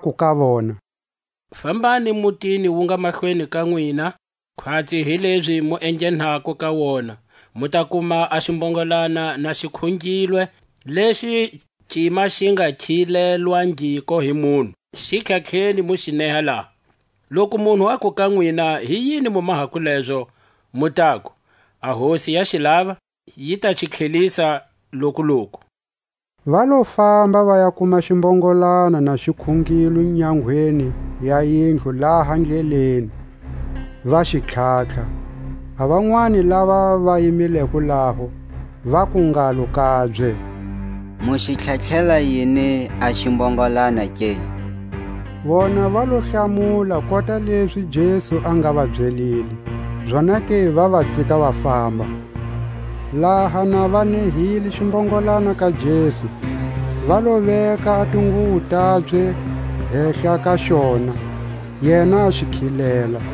aku ka vona: Fambani mutini wu nga mahlweni ka nwina; khwatsi hilezi mu enghenako ka wona, mu ta kuma a ximbongolana na xi khungilwe, lexi cima xi nga khilelwangiko hi munhu; xi tlhatlheni, mu xi neha laha. Loku munhu aku ka nwina: Hi yini mu mahako lezo? Mu taku: A Hosi ya xi lava, yi ta xi tlhelisa lokuloku. Va lo famba, va ya kuma ximbongolana na xi khungilwe nyangweni ya yindlu laha ndleleni; va xi tlhatlha. A vanwani lava va yimileko laho, vaku ngalo kabye: Mu xi tlharihela yini a ximbongolana ke? Vona va lo hlamula kota lezi Jesu a nga va byelile, zonake va va tsika va famba. Laha na va nehile ximbongolana ka Jesu, va lo veka a tinguwo tabye hehla ka xona, yena a xi khilela.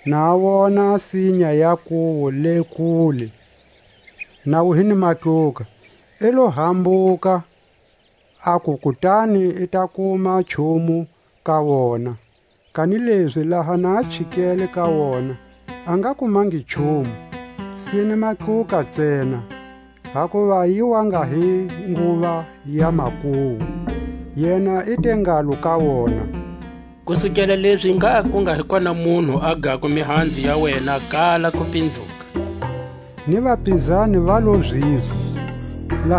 na a wona a sinya ya nkuwu le kule, na wu hi ni matluka, i lo hambuka aku kutani i ta kuma nchumu ka wona; kanilezi laha na a chikele ka wona, a nga kumangi nchumu, sine matluka ntsena, hakuva yi wa nga hi nguva ya makuwu. Yena i te ngalo ka wona: Kusukela lezi ngha ku nga hi kona munhu a gako mihanzu ya wena kala kupinzuka. Ni vapizani va lo zizwa. Jesu a basisa tempeli.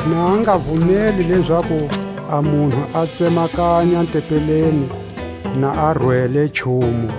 na a nga vumeli lezaku a munhu a tsemakanya tempeleni na a rwele nchumu.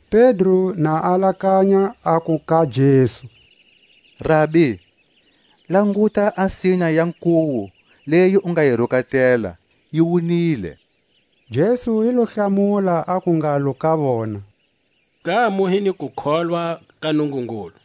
Pedro na alakanya, aku ka Jesu: Rabi, languta a sinya ya nkuwu leyi u nga yi rukatela, yi wunile. Jesu i lo hlamula, aku ngalo ka vona: Ngha mu hi ni kukholwa ka Nungungulu.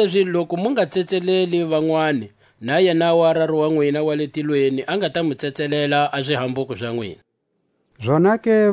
Kanilezi loku mu nga tsetseleli vanwani, na yenawu a Raru wa nwina wa le tilweni a nga ta mu tsetselela a zihambuko za nwina. Jesu a wutisiwa hi ntamu wakwe.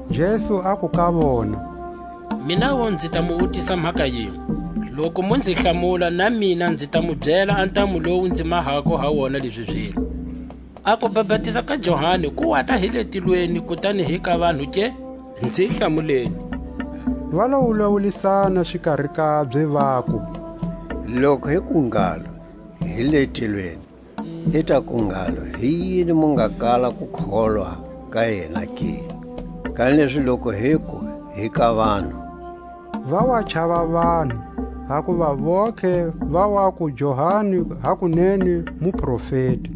Jesu aku ka vona: Minawu nzi ta mu wutisa mhaka yinwe; loku mu nzi hlamula, na mina nzi ta mu byela a ntamu lowu nzi mahako ha wona lezi zilo. A kubapatiza ka Johani ku wata hi le tilweni, kutani hi ka vanhu ke? Nzi hlamuleni. Va lo wulawulisana xikari kabye, vaku: Loku hi ku ngalo: Hi le tilweni; i ta ku ngalo: Hi yini mu nga kala ku kholwa ka yena ke? Kanilezi loku hiku: Hi ka vanhu—va wa chava vanhu, hakuva vontlhe va waku Johani hakunene muprofeti.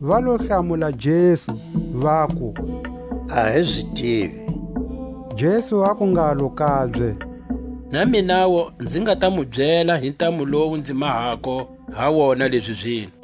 Va lo hlamula Jesu, vaku: A hi zi tivi. Jesu aku ngalo kabye: Na minawu nzi nga ta mu byela hi ntamu lowu nzi mahako he wona lezi zilo.